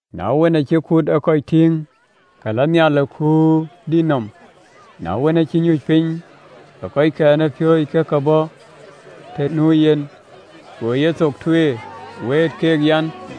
Na wën, acï kut ë kɔc tïŋ, ke lɔ nhial ë kuur dït nɔm, na wën acï nyuc piny, ke kɔckɛn ë piööcë ke ke bɔ̈ të nu yen thïn, go yethok tueer, wëët keek an: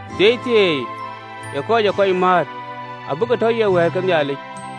Thieithieei ë kɔc ë kɔc määt, abï ke tɔ ye wɛ̈ɛ̈t ke Nhialic.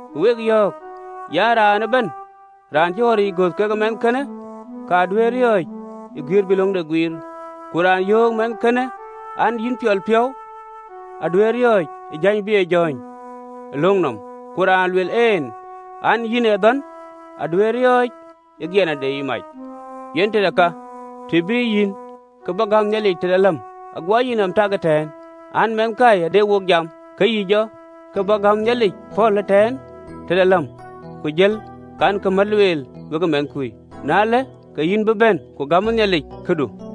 Ku wek yɔ̈ɔ̈k, an, “Raan ëbɛ̈n raan cï ɣɔ̈ric gɔ̈th: na cï gɔ̈th; aye këcïgɔ̈ɔ̈r däŋlueel an na göth ɣɔ̈ric. kekë mɛnhkënë, ka duëër riɔ̈ɔ̈c ë guiëër bï löŋde guiir, ku raan yöök mɛnhkënë, an, Yïn piɔl piɔ̈u, aduëër riɔ̈ɔ̈c ë jäny bï ë jɔ̈ɔ̈ny ë löŋ nɔm, ku raan lueel en, an, “Yïn ee dhɔ̈n, aduëër riɔ̈ɔ̈c ë giɛna de mac. Yen tëde ka, të bïï yïn kë bä gäm Nhialic në yïïŋ de läm nɔm, ago yïnɔm tak ëtɛ̈ɛ̈n, an, mɛnhkui adɛ wek jam, ke yï lɔ kë bä gäm Nhialic pɔ̈l ëtɛ̈ɛ̈n tëde yïïŋ de läm, ku jël kankï mät lueel wekë mɛnhkui, na ëlë, ke yï be bɛ̈n, ku gämë Nhialic këdu.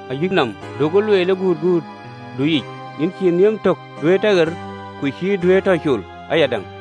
Ayï yïnɔm, du ee kuëëŋ ë yen, yïn cïï nhiëm tök duëër tɔ ɣer, ku cïï duëër tɔ col ayadäŋ.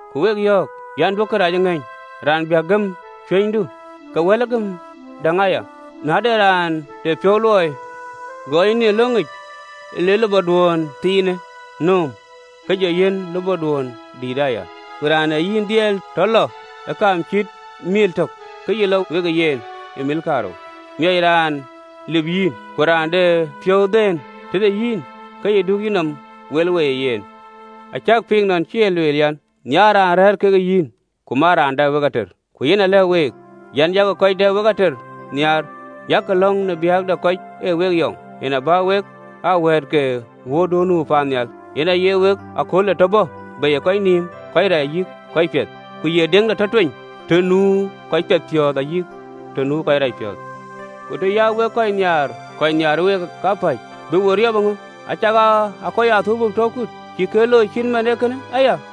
Ku wek yɔ̈ɔ̈k an, ‘Duökï kërac ë ŋëny raan biäk gëm cuënydu, ke wɛ̈lë gëm däŋ aya.’ Ku na de raan de piɔ̈u luɔi gɛɛny en yïn ë löŋic, le lupɔduön thiinë nööm, ke jɔ yiɛ̈n alulutdu aya. Ku raan ë yïn dhiɛl tɔ lɔ ë kaam cït meel tök, ke yï lɔ wekë yen ë meel kaarou. Miɔc raan lip yïn, ku raan de piɔ̈u dhɛ̈n tëde yïn, ke yï du yïnɔm wel wei ë yen. “Acäk piŋ nɔn cï e lueel an, ‘Nhiaar raan rɛ̈ɛ̈r ke yïn, ku man raan dɛ wek ater.’ Ku yɛn alɛ̈k week an, “Yak kɔc dɛ wek ater nhiaar, yak lɔ̈ŋ në biäk de kɔc ë week yɔŋ, Yen abä wek aa wɛ̈ɛ̈t ke wuöörduön nu paannhial, yen aye akölde tɔ bɔ̈ bei ë kɔc nïïm kɔc rac ayï kɔc piɛth, ku ye deŋde tɔ tueny të nu kɔc piɛthpiɔ̈ɔ̈th ayï kɔc racpiɔ̈ɔ̈th. Ku të ya wek kɔc nhiaar kapäc kɔc nhiaar week, bï we riöp ŋö? Acakaa kɔc ë athölbö tɔ kut, cïkï ë looi cït man ee kënë aya?